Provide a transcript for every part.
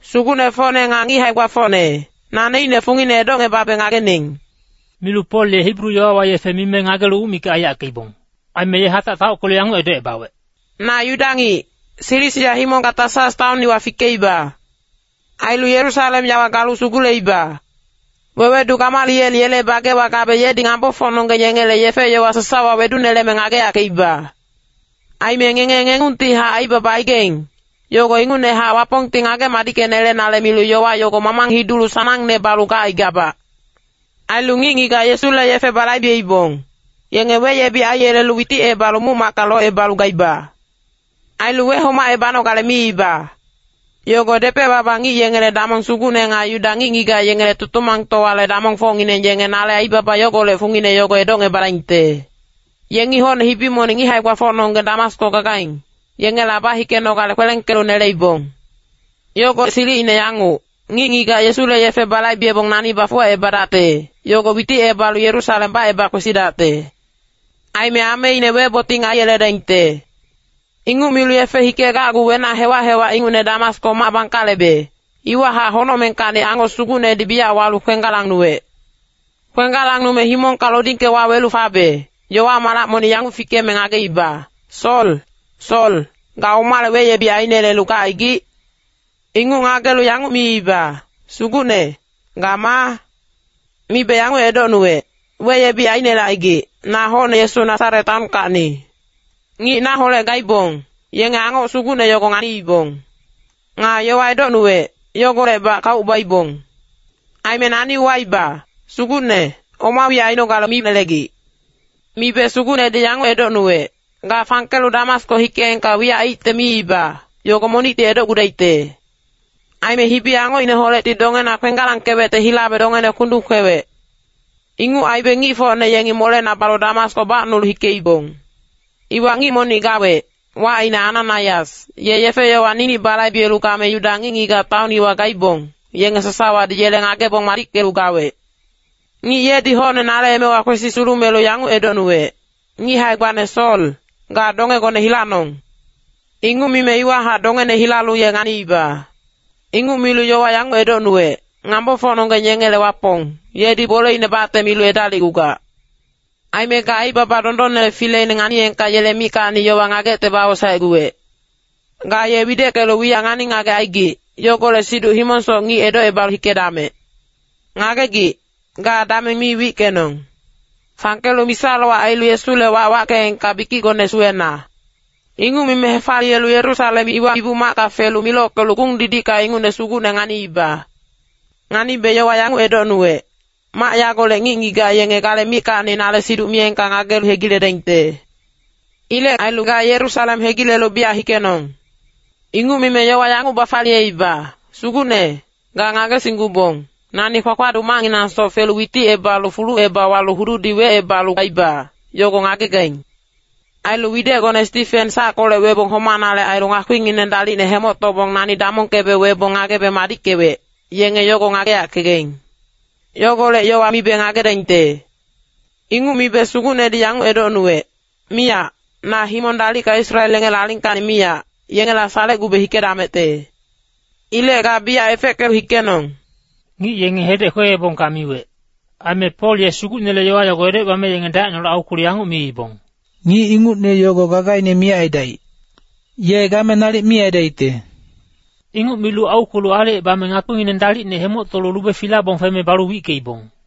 “Sugucnefocne nga ngic hae-gbafocne, naneicne fungine edocngebabe ngagening.” Milu Pol ye Hibru yowawa yefe mime ngagelu uc mikac aiyackeibong. Aime ye hatac taockelu yanguc edocebawec, “Na Yuda ngic, Silisia himongka Tasas taon iwa fikeiba. Ailu Yerusalem yawa galu suguleiba. Wewedu Gamaliel yele bagewa gabe yedi ngambofocnonggeng yengele yefe-yowa sasawa weduneleme ngageyackeiba. Aime ngenge yanguctihac aibaba aigaing, yogo ingucnehac Wapongti ngage-madickenelenale milu yowa yogo mamang hidulu sanangne balu gacaigabac. Ailu ngic-ngigac Yesule yefe balaibeibong, yenge weyebic aiyelelu witicebalu muc-macka locebalu gaiba. Ailu wehomacebanogale miiba. Yogo depec-baba ngic yengele damong sugucne nga Yuda ngic-ngigac yengele Tutumangtowale damongfocngineng yenge nale aibaba yogolec fungine yogo edocngebadaingte. Yengi hocne hibi monic ngic hae-gbafocnonggeng Damasko gagaing, yengela bahikenogale kwelengkelu neleibong. Yogo silicine yanguc, ngic-ngigac Yesule yefe balaibebong nani bafuwacebadacte, yogo witicebalu Yerusalem baceba kwesidacte. Aime ameine weboting aiyeledaingte. “Inguc milu yefe hikegacgu wenac hewac-hewac ingucne Damasko mac bangkalebe, iwahac honocmengkacni angoc sugucnedi biyac walu kwenggalangnuwec. Kwenggalangnume himongka lodingke wawelu fabe, yowa malac monic yanguc fikeme ngageiba, ‘Sol, Sol, ga omale weyebic ainelelu gacaigic?’ “Inguc ngagelu yanguc miiba, ‘Sugucne, ga maa?’ “Mibe yanguc edocnuwec, ‘Weyebic ainelecaigic, na hocne Yesu Nasaret taonkacni.’ Ngic naholec gaibong, yenge angoc sugucne yogo nganiibong. Nga yowa edocnuwec, yogolecbac kauc baibong. “Aime nani uwaiba, ‘Sugucne, oma wiyac ainogale minelegic.’ “Mibe Sugucnedi yanguc edocnuwec, ‘Ga fangkelu Damasko hikeengka wiyac aicte miiba, yogo monicti edocgudaicte.’ Aime hibi-angocineholecti dongena kwenggalangkewecte hilabe dongene kundung kwewec. Inguc aibe ngicfocne yengi molena balu Damasko bacnulu hikeibong. “Iwa ngic monic gawec, wacine Ananaias, ye yefe-yowa ninic balaibelu game Yuda ngic-ngigac taon iwa gaibong, yenge sasawadi yele ngagebong madickelu gawec. Ngic yedi hocne nale emewa kwesi sulumelu yanguc edocnuwec, ‘Ngic hae-gbane Sol, ga dongegone hilanong.’ Inguc mime iwahac dongene hilalu ye nganiiba. “Inguc milu yowa yanguc edocnuwec, ‘Ngambofocnonggeng yengele Wapong, yedi boleine bacte milu edalicgugac. Aime ga Aibaba Dondonnele Fileine nganiyengka yele mickacni yowa ngagecte bawosaecguwec. Ga ye wideckelu wiyac ngani-ngagec aigic, yogolec siduc himongsoc ngic edocebalu hikedamec. Ngagegic, ga dameng mi wickenong! Fangkelu misa-lowac ailu Yesule wac wackeengka bikicgone suwena.’ “Inguc mime hefaliyelu Yerusalem iwa Ibu-macka felu milockelu gung-didicka ingucne Sugucne nganiiba. Nganibe yowa yanguc edocnuwec, ‘Mac yagolec ngic-ngigac yenge gale mickacni nale siduc miyengka ngagelu hegiledaingte. Ilec ailu ga Yerusalem hegilelu biyac hikenong.’ “Inguc mime yowa yanguc bafaliyeiba, ‘Sugucne, ga ngagesinggubong, nani kpakpaduc macnginangsoc felu witicebalu fuluceba walu hududi wecebalu gaiba, yogo ngagegaing. Ailu widecgone Stifen sackolec webong homanale ailu ngakpingineng dalicne hemoctobong nani damongkebe webong ngagebe madickewec, yenge yogo ngageyackegaing. Yogolec yowa mibe ngagedaingte.’ “Inguc mibe Sugucnedi yanguc edocnuwec, ‘Miyac, na himong dalicka Israel yengele alingkacni miyac, yengela salecgube hikedamecte. Ilec ga biyac efeckelu hikenong.’” Ngic yenge hedec kweebongka miwec. Aime Pol ye Sugucnele yowa yogo edocebame yenge dacineholec aukwelu yanguc miibong, “Ngic ingucne yogo gagaine miyac aidaic. Ye game nalic mi aidaicte.” Inguc milu aukwelu aalicebame ngakpingineng dalicne hemoctolu lube filabong feme balu wickeibong.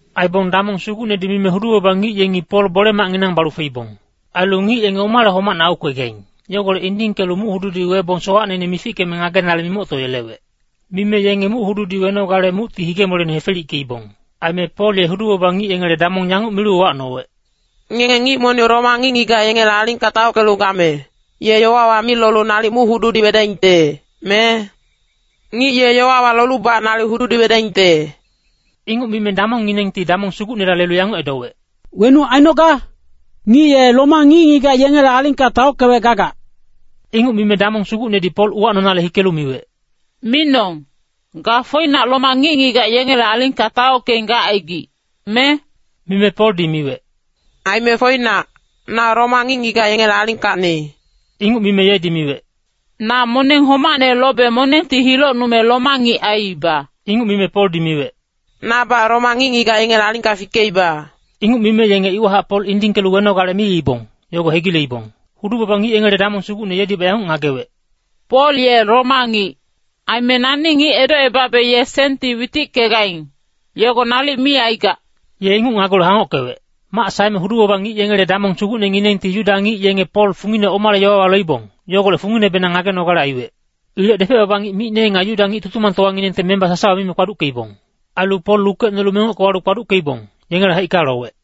Aibong damong sugucnedi mime hudu-baba ngic yengi Pol bole-macnginang balu feibong. Ailu ngic yenge omale homacne aukwegaing, yogolec indingkelu muc-hududi webong sowacneine mifickeme ngagenale mimoctoyelewec. Mime yenge muc-hududi wenogale mucti hige-moleine hefelickeibong. Aime Pol ye hudu-baba ngic yengele damong yanguc milu uwacnowec, “Ngenge ngic monic Roma ngic-ngigac yengele alingka taockelu game, ye yowawa mi lolu nalic muc-hududi wedaingte, me? Ngic ye yowawa lolubac nalic hududi wedaingte.” Inguc mime damongnginengti damong sugucnela lelu yanguc edowec, “Wenuc ainoga? Ngic ye Roma ngic-ngigac yengele alingka taockewec gagac.” Inguc mime damong sugucnedi Pol uwacnonale hikelu miwec, “Minong, ga foinac Roma ngic-ngigac yengele alingka taockeing gacaigic, me?” Mime Poldi miwec, “Aime foinac, na Roma ngic-ngigac yengele alingkacni.” Inguc mime yedi miwec, “Na moneng homacne lobe monengti hilocnume Roma ngic aiiba.” Inguc mime Poldi miwec, “Nabac Roma ngic-ngigac yengele alingka fikeiba.” Inguc mime yenge iwahac Pol indingkelu wenogale miibong, yogo hegileibong. Hudu-baba ngic yengele damong sugucne yedibac yanguc ngagewec, “Pol ye Roma ngic. Aime nani ngic edocebabe ye senti witickegaing, yogo nalic mi aigac!” Ye inguc ngagelu hangockewec. Mac saeme hudu-baba ngic yengele damong sugucnenginengti Yuda ngic yenge Pol fungine omale yowawa loibong, yogolec funginebenang ngagenogale aiwec. Ilec depec-baba ngic micne nga Yuda ngic Tutumangtowanginengte memba sasawa mime kpaduckeibong. Ailu Pol lukecnolu mengocke walu kpaduckeibong, yengele haicka lowec.